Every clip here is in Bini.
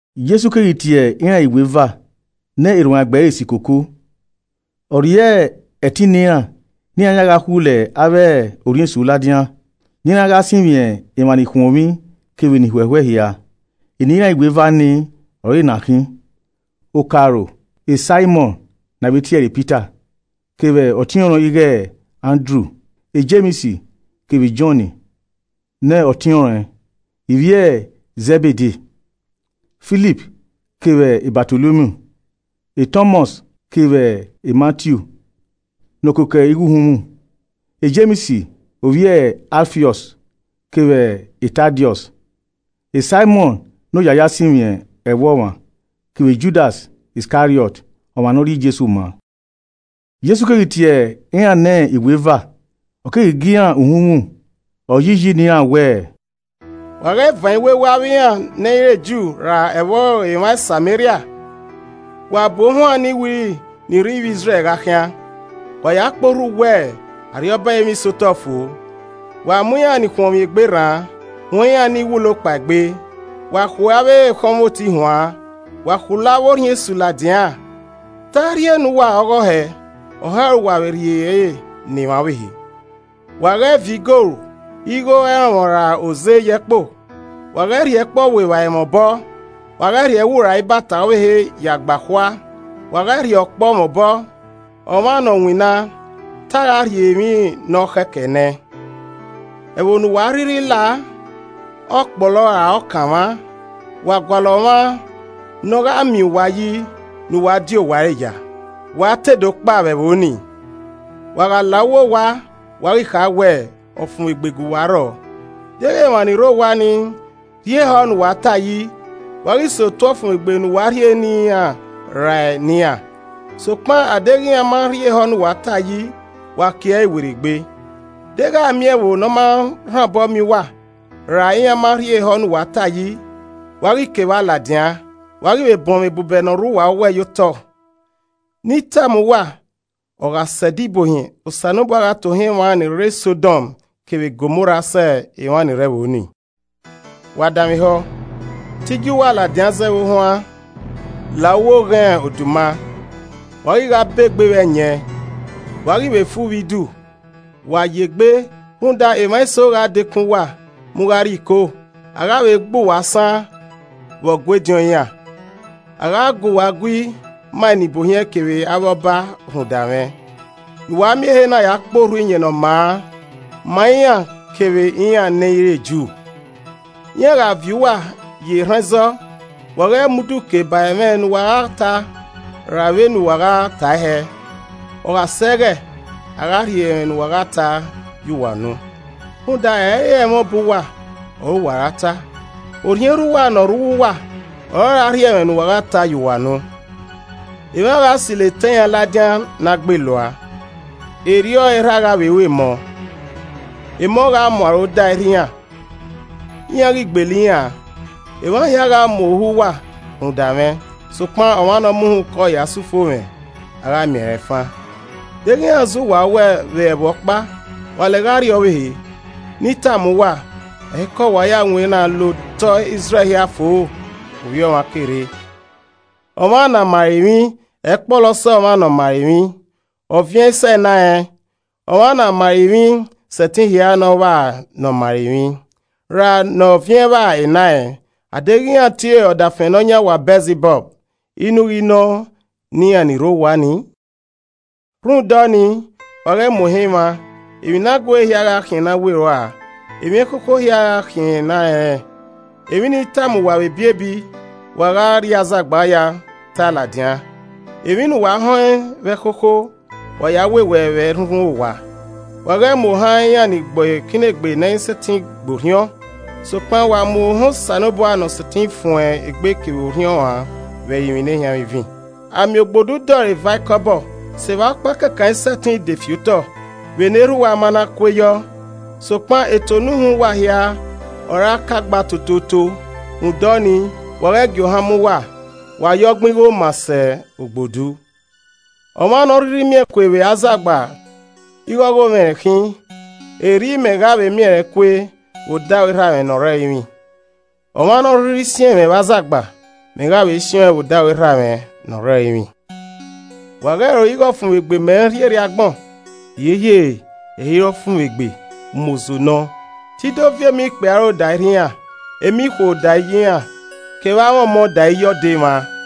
Jesu keghi tie iran iweva ne erhuanegbe ẹre si koko. Ọ rhie ẹtin ne iran ne iran ya gha khulo avbe orhiọn esu ladian, ne iran gha sinmwi emwa nikhuọnmwi kevbe ni huẹhuẹ hia. Eni iran iweva ni ọre ena khin: Okaro Saimọn (ne a vbe tiẹre Pita) kevbe ọtiọnrẹn ighe Andru Jems kevbe Jọn ne ọtiọnrẹn ivbi e Zẹbede. Filip kevbe Batolomiu Tọmọs kevbe Matiu ne ọ koko igho uhunmwu, Jems ovbi e Alfiọs, kevbe Tadiọs. Saimọn ne Oya a ya sinmwi ẹvbo ọmwa kevbe Judas Iskariọt, ọmwa ne ọ rhie Jesu maa. Jesu keghi tie iran ne iweva, ọ keghi gie iran uhunmwu, ọ yi iyi ne iran wẹẹ, “Wa ghẹ van iwewe avbe iran nẹ i re Ju ra ẹvbo emwa Sameria. Wa bu ohuan ni wiri ni rre ivbi Izrẹl gha khian. Wa ya kporhu wẹẹ, ‘Arriọba ẹrinmwi sẹ otọ fo.’ Wa mu iran ni khuọnmwi egbe rran, huẹn iran ni wulo kpaegbe, wa khue avbe ekhọnmwoti huan, wa khulo avbe orhiọn esu ladian. Te a rhie ne uwa ọghe ọhẹ, ọhẹ ọre uwa vbe rhie ẹre ne emwa ọvbehe. Wa ghẹ viọ igoru, igho ẹrọnmwọ ra oze ye ẹkpo. Wa ghẹ rhie ẹkpo ọ vbu evbare mwẹ obọ, wa ghẹ rhie ẹwu ra ibata ọvbehe ya gbe akhua, wa ghẹ rhie ọkpọ mwẹ obọ, ọmwa ne ọ winna, te a gha rhie emwi ne ọ khẹ kẹe nẹẹn. “Ẹvbo ne uwa a rhirhi lao, ọ kpọlọ ra ọ kanmwa, wa gualọ ọmwa ne ọ gha miẹn uwa yi ne uwa di owa ẹre ya, wa te do kpao vbe ẹvbo ni. Wa gha la uwu owa, wa ghi kha wẹẹ, ‘Ọfumwegbe guwa rrọọ.’ Deghẹ emwa ni rre owa ni rhie ehọ ne uwa ta yi, wa ghi sẹ otuẹ ọfumwegbe ne uwa rhie ne iran rae ne iran, sokpan a deghẹ iran ma rhie ehọ ne uwa ta yi, wa kie ẹre werriegbe. Deghẹ a miẹn ẹvbo ne ọ ma rhan obọ miẹn uwa ra iran ma rhie ehọ ne uwa ta yi, wa ghi kevba ladian, wa ghi vbe bọnmwẹ ebubẹ ni rre uwa owẹ ye otọ. Ne I tama uwa ọ gha sẹ ẹdẹ ibuohiẹn, Osanobua gha tohan emwa ni rre Sọdom kevbe Gomorra sẹ emwa ni rre ẹvbo ni. “Wa danmwehọ! Te I gie uwa ladian zẹ vbe ohuan la uwu oghẹn oduma. Wa ghi gha begbe vbe ẹyẹn, wa ghi vbe fu vbe idu. Wa yegbe, rhunmwuda emwa eso gha dekun uwa mu gha rrie iko, a gha vbe gbe uwa asan vbe Ọgua ediọn iran. A gha gu uwa gui ma enibuohiẹn kevbe avbe ọba rhunmwuda mwẹ, ne uwa miẹn ehe na kporhu Iyẹn Ne ọ maa ma iran kevbe iran ne ẹ i re Ju. Iran gha viọ uwa ye erhan ẹzọ, wa ghẹ mu udu kee ba ẹmwẹ ne uwa gha ta ra vbene uwa gha tae hẹ. Ọ gha sẹ ẹghẹ, a gha rhie ẹmwẹ ne uwa gha ta ye uwa unu. Rhunmwuda ẹ i re ẹmwẹ obọ uwa ọre uwa ra ta. Orhiọn Erha uwa ne ọ rre uwu uwa ọre ọ ra rhie ẹmwẹ ne uwa gha ta ye uwa unu. “Emwa gha silo etẹn iran ladian ne a gbelua, erriọ ọre erha gha vbe ru emọ. Emọ gha mu aro da erha iran, iran ghi gbele iran an. Emwa hia gha mu ohu uwa rhunmwuda mwẹ. Sokpan ọmwa ne ọ mu uhunmwu kọe ya sẹ ufomwẹ, a gha miẹn rẹn fan. Deghẹ iran zẹ uwa owẹ vbe ẹvbo ọkpa, wa lẹ gha rrie ọvbehe. Ne I tama uwa, ẹ i kẹ uwa ya winna la otọe Izrẹl hia fo Ovbi Ọmwa ke rre. “Ọmwa ne a ma ẹre emwi, ẹ i kpọlọ sẹ ọmwa ne ọ ma ẹre emwi. Ọviẹn i sẹ enarẹn. Ọmwa ne a ma ẹre emwi sẹtin hia ne ọ vba ne ọ ma ẹre emwi. Ra ne ọviẹn vba enarẹn. Adeghẹ iran tie ọdafẹn nọyan owa Bẹlzibọb, inu ghi nọ ne iran ni rre owa ni! “Rhunmwuda ọnii, wa ghẹ mu ohan emwa. Emwi ne a guere hia gha khian ne a we rua, emwi ẹkhokho hia gha khian ne a rẹnrẹn. Emwi ne I tama uwa vbe ebiebi, wa gha rrie azagba ya tae ladian, emwi ne uwa họn ẹn vbe ẹkhokho, wa ya wewẹe vbe ẹrhunrhun owa. Wa ghẹ mu ohan iran ni gbe ikinnegbe ne ẹ i sẹtin gbe orhiọn, sokpan wa mu ohan Osanobua ne ọ sẹtin fuẹn egbe kevbe orhiọn uan vbe ẹrinmwi nehianmwivin. A miẹn ogbodu dẹ ọre eva ikọbọ. Sevba ọkpa kẹkan i sẹtin de fi otọ vbene Erha uwa ma na kue yọ. Sokpan eto ne uhunmwu uwa hia ọre a ka gba totooto. Rhunmwuda ọnii, wa ghẹ gie ohan mu uwa. Wa ya ọgbin igho maa sẹ ogbodu! “Ọmwa ne ọ rhirhi miẹn kue vbe azagba ighe ọghomwẹ rẹn khin, erriọ mẹ gha vbe miẹn rẹn kue vbe odaro Erha mwẹ ne ọ rre ẹrinmwi. Ọmwa ne ọ rhirhi siẹn mwẹ vbe azagba, mẹ gha vbe siẹn ọẹn vbe odaro Erhamwẹ ne ọ rre ẹrinmwi. “Wa ghẹ ro ighe ọfumwegbe mẹ rhie rrie agbọn, hiehiere, ẹ i re ọfumwegbe, umozo nọ. Te I do viọ emọ ikpia aro da erha iran, emọ ikhuo da iye iran kevbe amwẹ ọmọ da iye ọdọ emwa.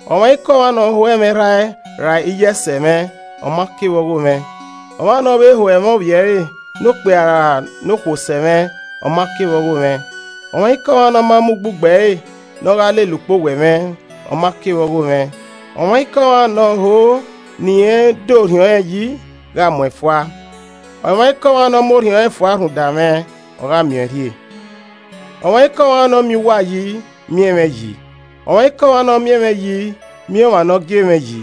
“Ọmwaikọmwa ne ọ ho ẹmwẹ erha ẹe ra iye ẹe sẹ mwẹ, ọ ma ke vbe ọghomwẹ, ọmwa ne ọ vbe ho ẹmwẹ ovbi ẹre nokpia ra nokhuo sẹ mwẹ, ọ ma ke vbe ọghomwẹ. Ọmwaikọmwa ne ọ ma mu ugbugbe ẹre ne ọ gha lele ukpowẹ mwẹ, ọ ma ke vbe ọghomwẹ. Ọmwaikọmwa ne ọ ho ne irẹn da orhiọn rẹn yi gha mu ẹn fua. Ọmwaikọmwa ne ọ mu orhiọn rẹn fua rhunmwuda mwẹ, ọ gha miẹn ọẹn rhie. “Ọmwaikọmwa ne ọ miẹn uwa yi, miẹn mwẹ yi, ọmwaikọmwa ne ọ miẹn mwẹ yi, miẹn ọmwa ne ọ gie mwẹ yi.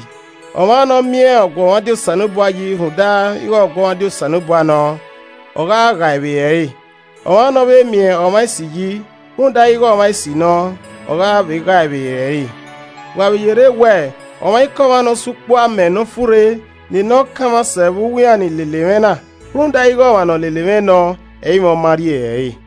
Ọmwa ne ọ miẹn ọguọmwadia Osanobua yi rhunmwuda ighẹ ọguọmwadia Osanobua nọ, ọ gha ghae vbe ere ẹre. Ọmwa ne ọ vbe miẹn ọmwa esi yi rhunmwuda ighẹ ọmwa esi nọ, ọ gha vbe ghae vbe ere ẹre. Wa vbe yerre wẹẹ, ọmwaikọmwa ne ọ sa ukpu amẹ nọfurre ne ne ọ kanmwa sẹ vbe uwu iran ni lele mwẹ na, rhunmwuda ighẹ ọmwa ne ọ lele mwẹ nọ, ẹ i mwẹ ọ ma rri ere ẹre.”